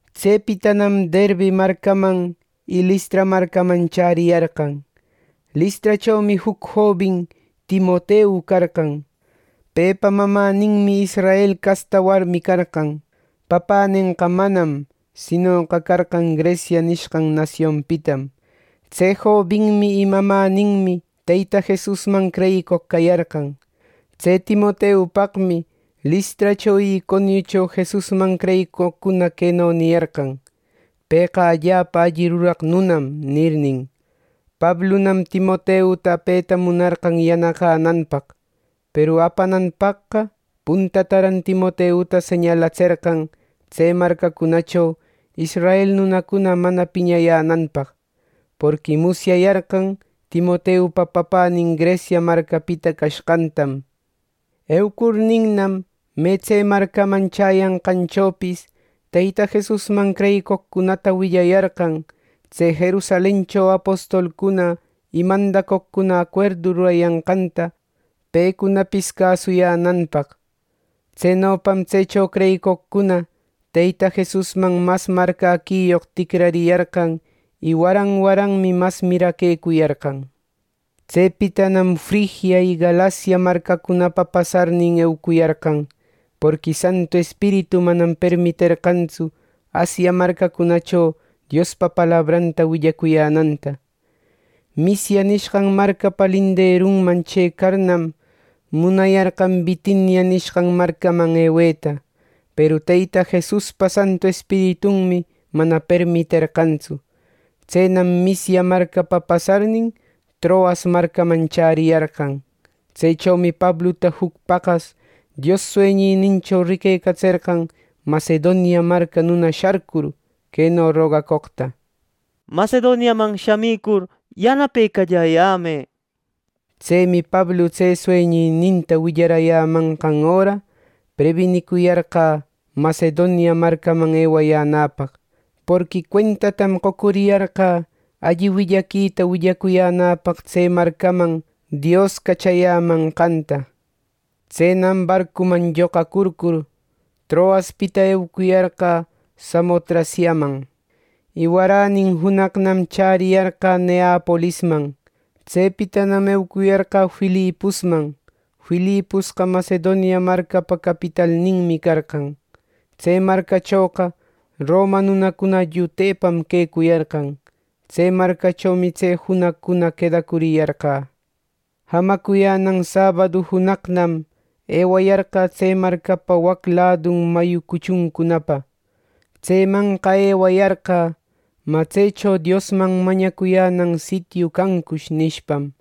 Tsepitanam Derbe marcaman y Listra marcaman chäriyarqan. Listrachomi juc jobin Timoteu carqan. Pepa mamäninmi israel casta warmi carqan. Papänenqa manam; sinoqa carqan Grecia nishqan nasionpitam. Tse jobinmi y mamäninmi Teyta Jesusman creyicoq cayarqan. Tse Timoteupaqmi Listracho y Iconiucho Jesusman creyicoqcuna queno niyarqan: “Pëqa allapa alli ruraq nunam” nirnin. Pablunam Timoteuta apeta munarqan yanaqänanpaq. Peru apananpaqqa puntataran Timoteuta señalatserqan tse marcacunacho israel nunacuna mana piñayänanpaq, porqui musyayarqan Timoteupa papänin Grecia marcapita cashqantam. Eucurninnam me tse marcaman chäyanqanchopis Teyta Jesusman creyicoqcunata willayarqan tse Jerusalencho apostolcuna y mandacoqcuna acuerdu rurayanqanta pecunapis cäsuyänanpaq. Tsenopam tsecho creyicoqcuna Teyta Jesusman mas marcäquiyoq ticrariyarqan y waran waranmi mas miraquecuyarqan. Tsepitanam Frigia y Galacia marcacunapa pasarnin eucuyarqan, porqui Santu Espiritu manam permiterqantsu Asia marcacunacho Diospa palabranta willacuyänanta. Misia nishqan marcapa linderunman chëcarnam, munayarqan Bitinia nishqan marcaman eweta, peru Teyta Jesuspa Santu Espiritunmi mana permiterqantsu. Tsenam Misia marcapa pasarnin, Troas marcaman chäriyarqan. Tsechomi Pabluta juc paqas Dios sueñinincho ricatserqan Macedonia marca nuna sharcur queno rogacoqta: “Macedoniaman shamicur yanapecalläyämë” neqta. Tsemi Pablu tse sueñininta willarayämanqan öra prebinicuyarqä Macedonia marcaman ewayänäpaq, porqui cuentatam qocuriyarqä alli willaquita willacuyänäpaq tse marcaman Dios cachayämanqanta. Tsenam barcuman lloqacurcur, Troaspita eucuyarqä Samotraciaman. Y waränin junaqnam chäriyarqä Neapolisman. Tsepitanam eucuyarqä Filiposman. Filiposqa Macedonia marcapa capitalninmi carqan. Tse marcachoqa Roma nunacuna llutepam quecuyarqan. Tse marcachomi tse junaqcuna quedacuriyarqä. Jamacuyänan sabadu junaqnam ewayarqä tse marcapa wac ladun mayu cuchuncunapa. Tsemanqa ewayarqä “¿Mä tsecho Diosman mañacuyänan sitiu cancush?” nishpam.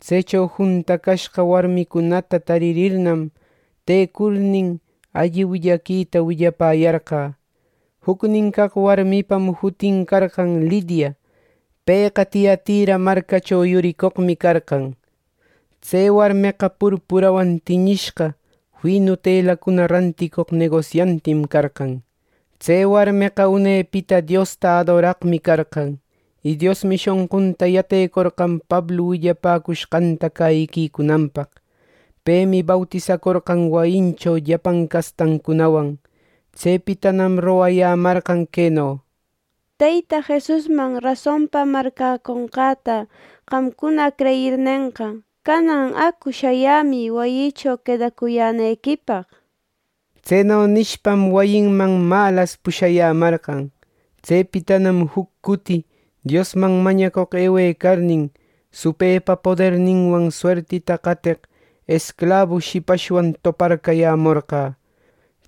Tsecho juntacashqa warmicunata taririrnam tecurnin, alli willaquita willapäyarqä. Jucnin caq warmipam jutin carqan Lidia. Pëqa Tiatira marcacho yuricoqmi carqan. Tse warmeqa purpurawan tiñishqa finu telacunata ranticoq negosiantim carqan. Tse warmeqa unepita Diosta adoraqmi carqan, y Diosmi shonqunta yatecorqan Pablu willapäcushqanta cäyiquicunanpaq. Pemi bautisacorqan wayincho llapan castancunawan, Tsepitanam rogayämarqan queno: —Teyta Jesusman rasonpa marcäconqäta qamcuna creyirnenqa, canan acu shayämï wayïcho quedacuyänequipaq —nir. Tseno nishpam wayinman malas pushayämarqan. Tsepitanam juc cuti Diosman mañacoq ewecarnin, supëpa poderninwan suertita cateq esclabu shipashwan toparcayämorqä.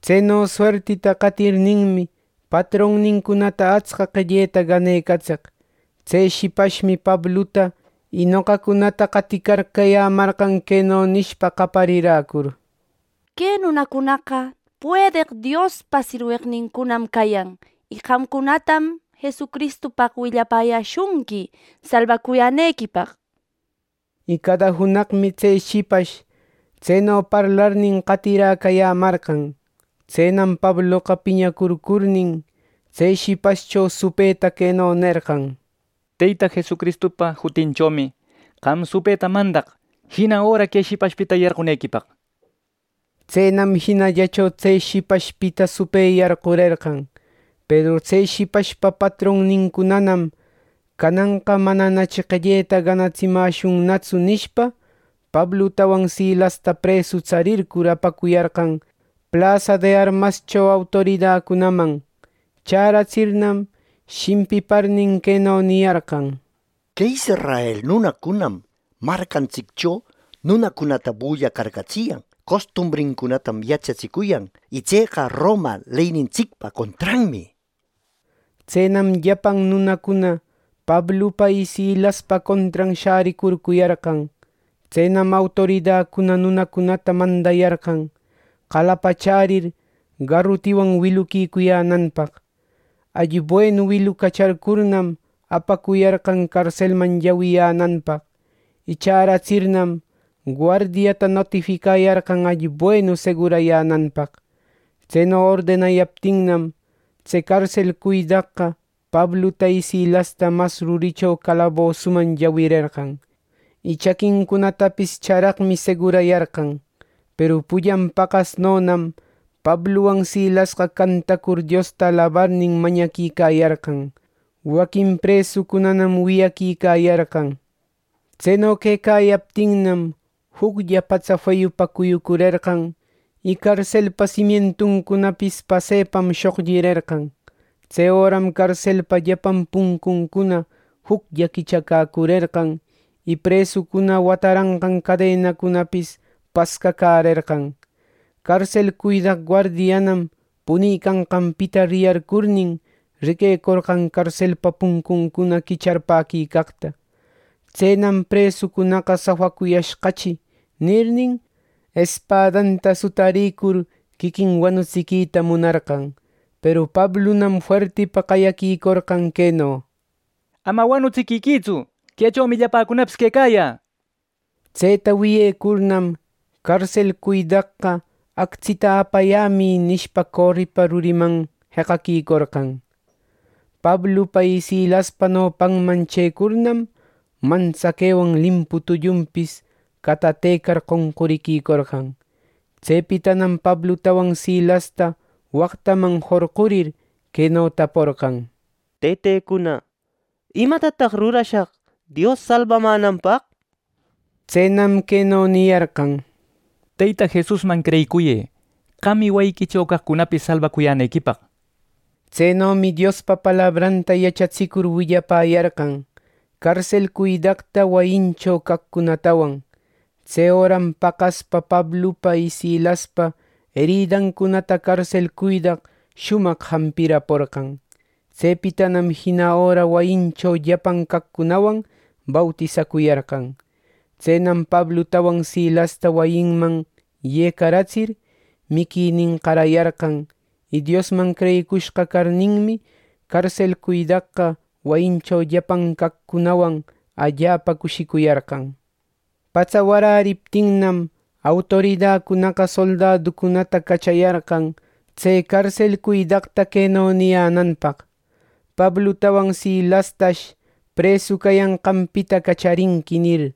Tseno suertita qatirninmi, patronnincunata atsca qelleta ganecatseq. Tse shipashmi Pabluta y noqacunata qaticarcayämarqan queno nishpa qayariräcur: —¡Que nunacunaqa puedeq Diospa sirweqnincunam cayan y qamcunatam Jesucristupaq willapäyäshunqui salbacuyänequipaq! —nir. Y cada junaqmi tse shipash tseno parlarnin qatiräcayämarqan. Tsenam Pabloqa piñarcurnin tse shipashcho supëta queno nerqan: —¡Teyta Jesucristupa jutinchomi, qam supëta mandaq jina öra que shipashpita yarqunequipaq! —nishpa. Tsenam jinallacho tse shipashpita supë yarqurerqan. Peru tse shipashpa patronnincunanam, “Cananqa mananachi qelleta ganatsimäshunnatsu” nishpa, Pablutawan Silasta presu tsarircur apacuyarqan plasa de armascho autoridacunaman. Chäratsirnam shimpiparnin queno niyarqan: —Que israel nunacunam marcantsiccho nunacunata bullacarcatsiyan. Costumbrincunatam yachatsicuyan, y tseqa Roma leynintsicpa contranmi, nir. Tsenam llapan nunacuna Pablupa y Silaspa contran shäricurcuyarqan. Tsenam autoridacuna nunacunata mandayarqan, qalapachärir garutiwan wiluquicuyänanpaq. Alli buenu wilucachärcurnam apacuyarqan carselman llawiyänanpaq. Y chäratsirnam guardiata notificayarqan alli buenu segurayänanpaq. Tseno ordenayaptinnam tse carsel cuidaqqa Pabluta y Silasta mas ruricho calabosuman llawirerqan, y chaquincunatapis charaqmi segurayarqan. Peru pullan paqasnonam Pabluwan Silasqa cantacur Diosta alabarnin mañaquicayarqan. Waquin presucunanam wiyaquicayarqan. Tseno quecayaptinnam, juclla patsa feyupa cuyucurerqan y carselpa simientuncunapis pasepa shoqllirerqan. Tse öram carselpa llapan puncuncuna juclla quichacäcurerqan y presucuna wataranqan cadenacunapis pascacärerqan. Carsel cuidaq guardianam punicanqanpita riyarcurnin riquecorqan carselpa puncuncuna quicharpäquicaqta. Tsenam “Presucunaqa safacuyashqachi” nirnin, espadanta sutarïcur quiquin wanutsiquita munarqan. Peru Pablunam fuertipa qayaquicorqan queno: —¡Ama wanutsiquiquïtsu! Quechomi llapäcunapis quecayä —nishpa. Tseta wiyecurnam, carsel cuidaqqa, “Actsita apayämï” nishpa, coripa ruriman jeqaquicorqan. Pablupa y Silaspa nopanman chëcurnam, mantsaquewan limpu tullunpis catatecar qonquriquicorqan. Tsepitanam Pablutawan Silasta waqtaman jorqurir queno taporqan: —Tëtecuna, ¿Imatataq rurashaq Dios salbamänanpaq? —nir. Tsenam queno niyarqan: —Teyta Jesusman creyicuyë, qam y wayiquicho caqcunapis salbacuyänequipaq —nir. Tsenomi Diospa palabranta yachatsicur willapäyarqan, carsel cuidaqta wayincho caqcunatawan. Tse öram paqaspa Pablupa y Silaspa eridancunata carsel cuidaq shumaq jampiraporqan. Tsepitanam jina öra wayincho llapan caqcunawan bautisacuyarqan. Tsenam Pablutawan Silasta wayinman yecaratsir, miquinin qarayarqan. Y Diosman creyicushqa carninmi, carsel cuidaqqa wayincho llapan caqcunawan allapa cushicuyarqan. Patsa waräriptinnam autoridacunaqa soldaducunata cachayarqan tse carsel cuidaqta queno niyänanpaq, “Pablutawan Silastash presu cayanqanpita cacharinqui” nir.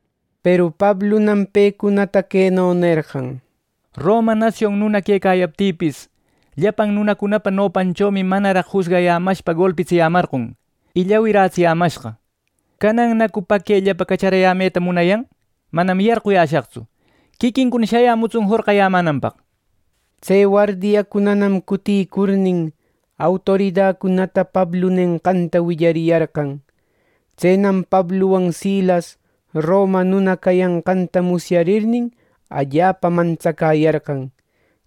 Peru Pablunam pecunata queno nerqan: —Roma nasion nuna quecayaptïpis, llapan nunacunapa nopanchomi manaraq jusgayämashpa golpitsiyämarqon y llawiratsiyämashqa. ¿Canannacu paquellapa cacharayämeta munayan? ¡Manam, yarquyäshaqtsu! Quiquincuna shayämutsun jorqayämänanpaq. Tse wardiacunanam cutïcurnin, autoridacunata Pablu nenqanta willariyarqan. Tsenam Pabluwan Silas roma nuna cayanqanta musyarirnin, allapa mantsacäyarqan.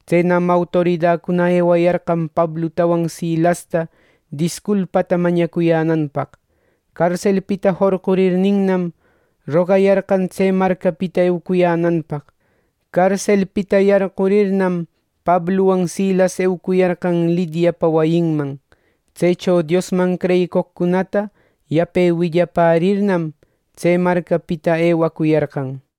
Tsenam autoridacuna ewayarqan Pablutawan Silasta disculpata mañcuyänanpaq. Carselpita jorqurirninnam rogayarqan tse marcapita eucuyänanpaq. Carselpita yarqurirnam Pabluwan Silas eucuyarqan Lidiapa wayinman. Tsecho Diosman creyicoqcunata yape willapärirnam, tse marcapita ewacuyarqan.